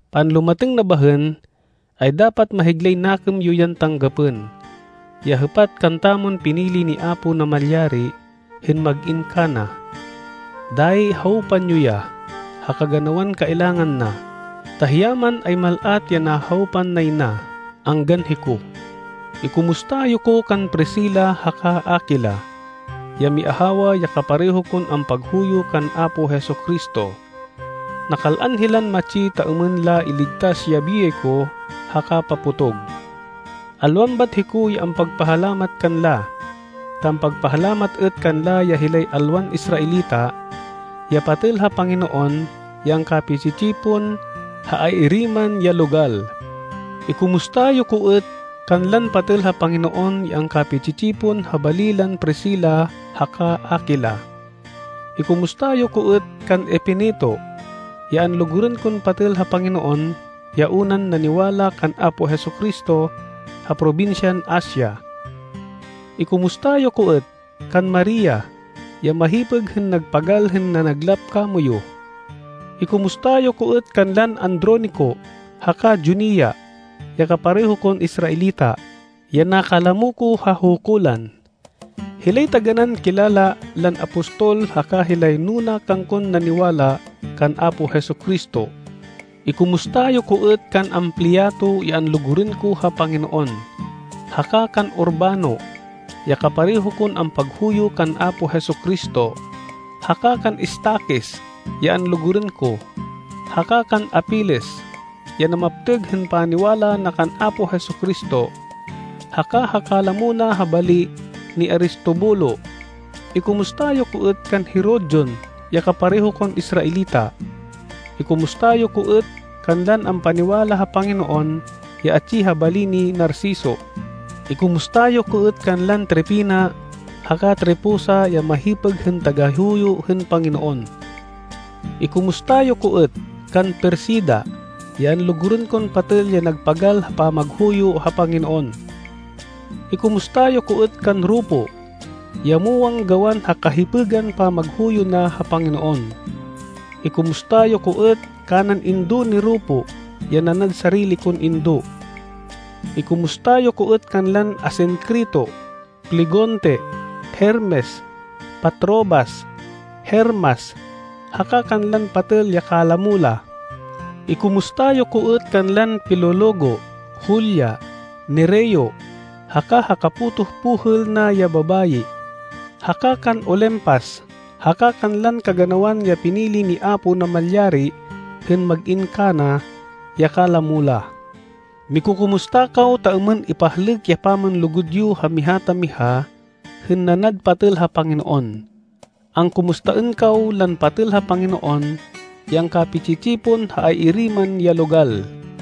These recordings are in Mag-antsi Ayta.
Panlumatêng na bahên, ay dapat mahiglay nakêm yo yan tanggapên, ya hêpat kantamon pinili ni Apo Namalyari hên mag-in kana. Dayi hawpan yo ya ha kaganawan kailangan na, ta hiya man ay mal-at ya nahawpan nay na, anggan hiko. Ikumusta yo ko kan Priscila haka Aquila, ya miahawa ya kapareho kon ampaghuyo kan Apo Jesu-Cristo. Nakal-an hilan matsi ta êmên la iligtas ya biyay ko ha kapapotog. Alwan bat hiko ya ampagpahalamat kanla, ta ampagpahalamat êt kanla ya hilay alwan Israelita, ya patêl ha Panginoon ya angkapi-tsi-tsipon ha ay-iri man ya logal. Ikumusta yo ko êt kanlan patêl ha Panginoon ya angkapi-tsi-tsipon ha bali lan Priscila haka Aquila. Ikumusta yo ko êt kan Epeneto ya anlugurên kon patêl ha Panginoon ya unan naniwala kan Apo Jesu-Cristo ha probinsyan Asia. Ikumusta yo ko êt kan Maria ya mahipêg hên nagpagal hên nanaglap kamoyu. Ikumusta yo ko êt kanlan Andronico haka Junia ya kapareho kon Israelita, ya nakalamo ko ha hukulan. Hilay taganán kilala lan apostol haka hilay nuna kangkon naniwala kan Apo Jesu-Cristo. Ikumusta yo ko êt kan Ampliato ya anlugurên ko ha Panginoon, haka kan Urbano, ya kapareho kon ampaghuyo kan Apo Jesu-Cristo, haka kan Estaquis, ya anlugurên ko, haka kan Apeles, ya namaptêg hên paniwala na kan Apo Jesu-Cristo, haka ha kalamo na ha bali ni Aristobulo. Ikumusta yo ko êt kan Herodion ya kapareho kon Israelita. Ikumusta yo ko êt kanlan ampaniwala ha Panginoon ya atsi ha bali ni Narciso. Ikumusta yo ko êt kanlan Trifena haka Trifosa ya mahipêg hên tagahuyo hên Panginoon. Ikumusta yo ko êt kan Persida ya anlugurên kon patêl ya nagpagal ha pamaghuyo ha Panginoon. Ikumusta yo ko êt kan Rufo, ya muwang gawan ha kahipêgan pamaghuyo na ha Panginoon. Ikumusta yo ko êt kanan indo ni Rufo ya nanad sarili kon indo. Ikumusta yo ko êt kanlan Asincrito, Flegonte, Hermes, Patrobas, Hermas haka kanlan patêl ya kalamo la. Ikumusta yo ko êt kanlan Filologo, Julia, Nereo haka ha kapotoh pohêl na ya babayi, haka kan Olimpas haka kanlan kaganawan ya pinili ni Apo Namalyari hên mag-in kana, ya kalamo la. Mikukumusta kaw ta êmên ipahlêk ya pamanlugud yo ha miha ta miha hên nanad patêl ha Panginoon. Angkumustaên kaw lan patêl ha Panginoon ya angkapi-tsi-tsipon ha ay-iri man ya logal.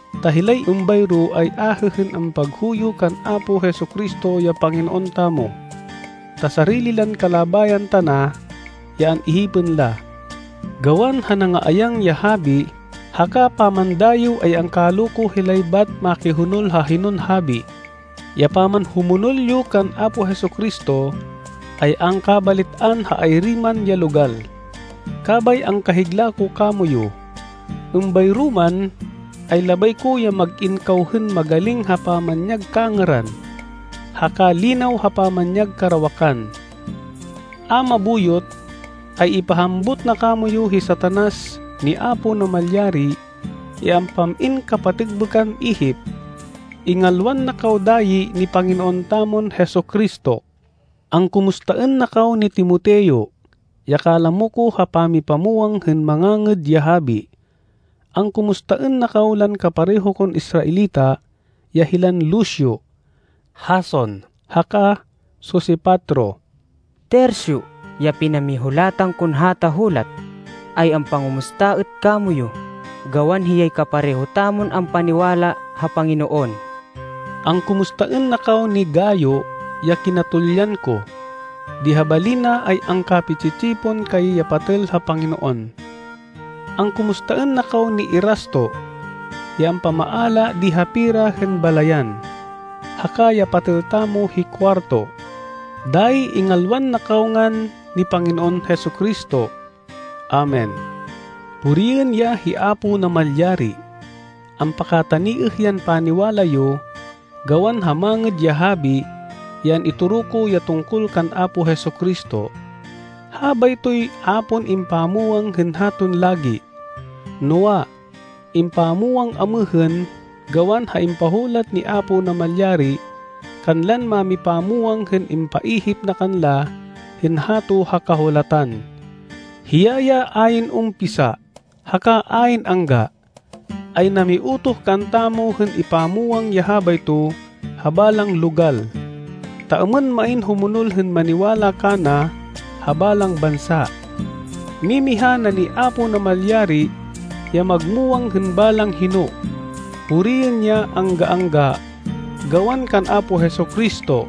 Ta hilay êmbayro ay ahê hên ampaghuyo kan Apo Jesu-Cristo ya Panginoon tamo, ta sarili lan kalabayan tana ya an-ihipên la. Gawan ha nangaayang ya habi haka pamandayêw ay angkaloko hilay bat makihonol ha hinon habi. Ya pamanhumonol yo kan Apo Jesu-Cristo ay angkabalit-an ha ay-iri man ya logal. Kabay angkahigla ko kamoyu. Êmbayro man, ay labay ko ya mag-in kaw hên magaling ha pamanyag kangêran, haka linaw ha pamanyag karawakan. A mabuyot, ay ipahambut na kamoyu hi Satanas ni Apo Namalyari ya ampam-in kapatêkbêkan ihip. Ingalwan na kaw dayi ni Panginoon tamon Jesu-Cristo. Angkumustaên na kaw ni Timoteo, ya kalamo ko ha pamipamwang hên Mangangêd ya Habi. Angkumustaên na kaw lan kapareho kon Israelita ya hilan Lucio, Jason haka Sosipatro. Tercio ya pinamihulatan kon hata hulat ay ampangumusta êt kamoyu gawan hiyay kapareho tamon ampaniwala ha Panginoon. Angkumustaên na kaw ni Gayo ya kinatulyan ko. Di ha bali na ay angkapi-tsi-tsipon kay ya patêl ha Panginoon. Angkumustaên na kaw ni Erasto, ya ampamaala di ha pera hên balayan, haka ya patêl tamo hi Cuarto. [Dayi ingalwan na kaw ngan ni Panginoon Jesu-Cristo. Amen.] Puriên ya hi Apo Namalyari! Ampakataniêh yan paniwala yo gawan ha Mangêd ya Habi ya an-itoro ko ya tungkol kan Apo Jesu-Cristo. Habaytoy a pon impamwang hên haton lagi, noa, impamwang amêhên gawan ha impahulat ni Apo Namalyari kanlan mámipamwang hên impaihip na kanla hên hato ha Kahulatan. Hiya ya ayn umpisa haka ayn angga, ay namiutoh kantamo hên ipamwang ya habayto ha balang logal, ta êmên main humonol hên maniwala kana ha balang bansa. Mimiha na ni Apo Namalyari ya magmuwang hên balang hino. Puriên ya angga-angga gawan kan Apo Jesu-Cristo!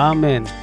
Amen.